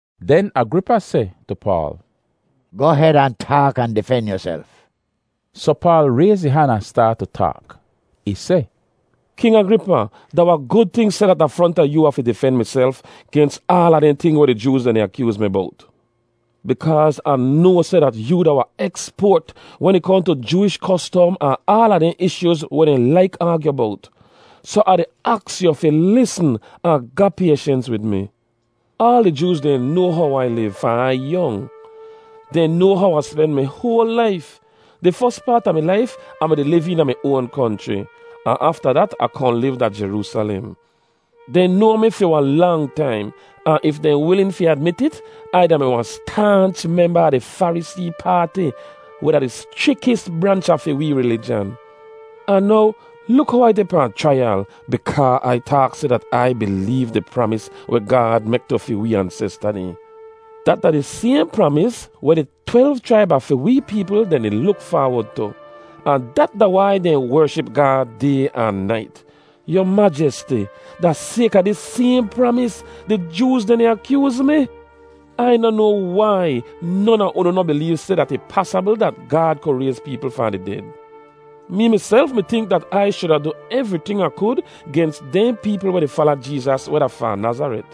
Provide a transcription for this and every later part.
Den Agripa seh tu Paal, “Goh hed ahn taak ahn difen yuself.” Soh Paal rayz ih han ahn staat tu taak. Ih seh, “King Agripa, da wahn gud ting seh dat da fronta yoo Ah fi difen miself gens aala dehn ting weh di Jooz dehn di akyooz mi bowt, bikaaz Ah noa seh dat yoo da wahn eksport wen ih kohn tu Jooish kostom ahn aala dehn ishyooz weh dehn laik aagyu bowt. Soh Ah di aks yu fi lisn ahn ga payshens wid mi. “Aal di Jooz dehn noa how Ai liv fahn Ai yong. Dehn noa how Ah spen mi hoal laif. Di fos paat a mi laif Ah mi-di liv eena mi oan konchri, ahn afta dat Ah kohn liv da Jeroosalem. Dehn noa mi fi wahn lang taim, ahn if dehn wilin fi admit it, Ai da-mi wahn staanch memba a di Farisee paati, weh da di schrikis branch a fi wee rilijan. Ahn now luk how Ai deh pahn chraiyal bikaa Ai taak seh dat Ai bileev di pramis weh Gaad mek tu fi wee ansesta dehn. Dat da di sayhn pramis weh di twelv chraib a fi wee peepl dehn di luk faawod tu, ahn dat da wai dehn wership Gaad day ahn nait. Yu Majesti, da sayka dis sayhn pramis, di Jooz dehn di akyooz mi. Ai noh noa wai non a unu noh bileev seh dat ih pasabl dat Gaad ku rayz peepl fahn di ded. “Mee miself mi tink dat Ai shuda du evriting Ah kud gens dehn peepl weh di fala Jeezas weh da fahn Nazaret.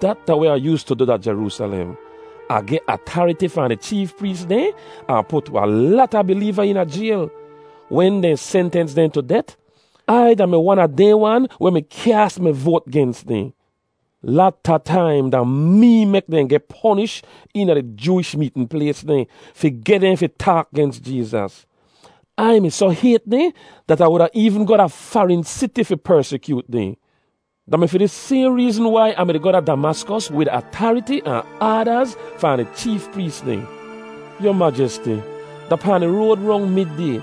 Dat da weh Ah yoostu du da Jeroosalem. Ah geh atariti fahn di cheef prees dehn ahn put wahn lata bileeva eena jayl. Wen dehn sentens dehn tu det, Ai da-mi wan a dehn wan weh mi kyaas mi voat gens dehn. Lata taim da mee mek dehn geh ponish eena di Jooish meetn plays dehn fi geh dehn fi taak gens Jeezas. Ai mi soh hayt dehn dat Ah wuda eevn goh da farin siti fi persikyoot dehn. “Da mi fi dis sayhn reezn wai Ah mi-di goh da Damaskos wid atariti ahn aadaz fahn di cheef prees dehn. Yu Majesti, da pahn di road rong mid-day,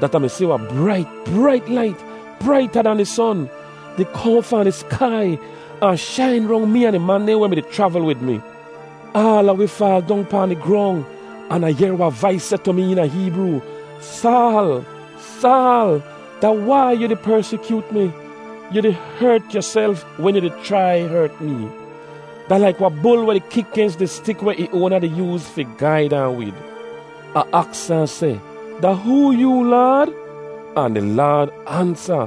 dat Ah mi si wahn brait, brait lait, braita dan di son, di kohn fahn di skai ahn shain rong mee ahn di man dehn weh mi-di chravl wid mi. Aala wi faal dong pahn di grong, an Ah yehr wahn vais seh tu mi eena Heebroo, ‘Saal, Saal! Da wai yu di persikyoot mi? Yu di hert yuself wen yu di chrai hert mee. Da laik wahn bul weh di kik gens di stik weh ih oana di yooz fi gaid ahn wid.’ “Ah aks ahn seh, ‘Da hoo yoo, Laad?’ “Ahn di Laad ansa,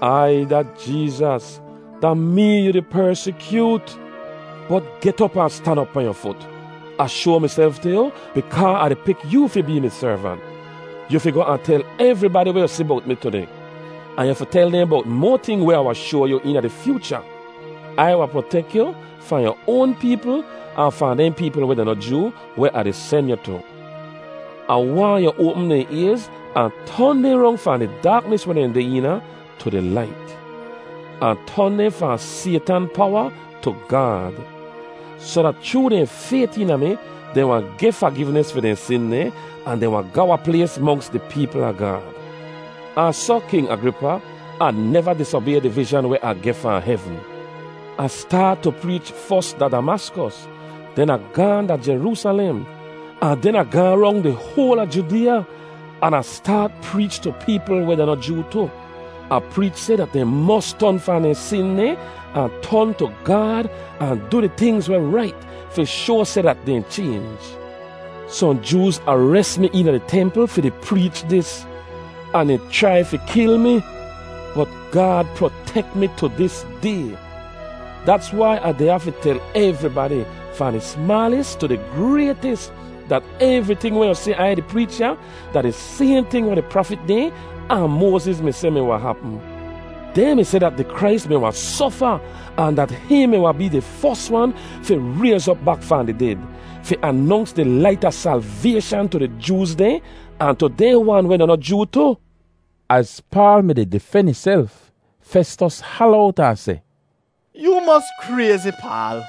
‘Ai da Jeezas. Da mee yu di persikyoot. Bot get op ahn stan op pahn yu fut. Ah shoa miself tu yu bikaa Ah di pik yoo fi bee mi servant. Yu fi goh ahn tel evribadi weh yu si bowt mi tudeh, ahn yu fi tel dehn bowt moa ting weh Ah wahn shoa yu eena di fyoocha. Ai wahn protek yu fahn yu oan peepl ahn fahn dehn peepl weh da noh Joo weh Ah di sen yu tu. Ah waahn yu oapm dehn ayz ahn ton dehn rong fahn di daaknis weh dehn deh eena tu di lait, ahn ton dehn fahn Saytan powa tu Gaad; soh dat chroo dehn fayt eena mi, dehn wahn geh fagivnis fi dehn sin dehn ahn dehn wahn ga wahn plays monks di peepl a Gaad.’ “Ahn soh, King Agripa, Ah neva disobay di vizhan weh Ah geh fahn hevn. Ah staat tu preech fos da Damaskos, den Ah gaahn da Jeroosalem, ahn den Ah gaahn rong di hoal a Judeeya, an Ah staat preech tu peepl weh da noh Joo tu. Ah preech seh dat dehn mos ton fahn dehn sin dehn ahn ton tu Gaad ahn du di tingz weh rait fi shoa seh dat dehn chaynj. Sohn Jooz ares mi eena di templ fi di preech dis, ahn dehn chrai fi kil mi. Bot Gaad protek mi tu dis day. Dats wai Ah deh ya fi tel evribadi, fahn di smaalis tu di graytis, dat evriting weh yu si Ai di preech ya da di sayhn ting weh di prafit dehn ahn Moaziz mi seh mi wahn hapm. Dehn mi seh dat di Krais mi wahn sofa ahn dat hihn mi wahn bee di fos wan fi rayz op bak fahn di ded, fi anonks di lait a salvayshan tu di Jooz dehn, ahn tu dehn wan weh da noh Joo tu.” Az Paal mi-di difen ihself, Festos hala owt ahn seh, “Yoo mos krayzi, Paal!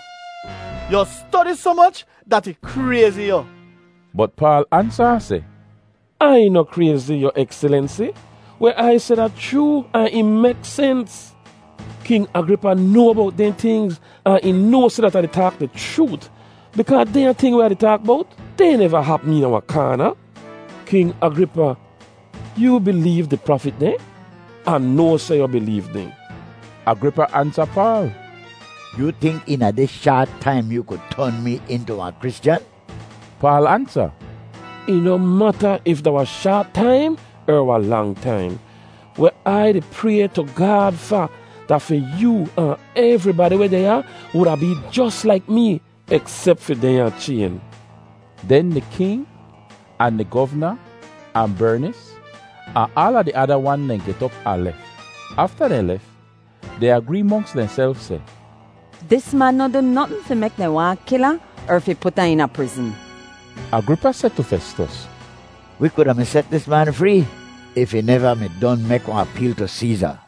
Yu stodi soh moch dat ih krayzi yu.” Bot Paal ansa ahn seh, “Ai noh krayzi, Yu Ekselensi! Weh Ai seh da chroo ahn ih mek sens. King Agripa noa bowt dehn tingz ahn ih noa seh dat Ah taak di chroot bikaa dehnya ting weh Ah di taak bowt, dehn neva hapm eena wahn kaana! “King Agripa, yoo bileev di prafit dehn? Ah noa seh yu bileev dehn.” Agripa ansa Paal, “Yoo tink eena dis shaat taim yoo ku ton mee intu wahn Kristyan?” Paal ansa, “Ih noh mata if da wahn shaat taim er wahn lang taim. Weh Ai di pray tu Gaad fa, da fi yoo ahn evribadi weh deh ya wuda bee jos laik mee eksep fi dehnya chayn.” Den di king, ahn di govna, ahn Bernis, ahn aala di ada wan dehn get op ahn lef. Afta dehn lef, dehn agree monks dehnself seh, “Dis man noh du notn fi mek dehn waahn kil ahn er fi put ahn eena prizn.” Agripa seh tu Festos, “Wi kuda mi set dis man free if ih neva mi don mek wahn apeel tu Seeza.”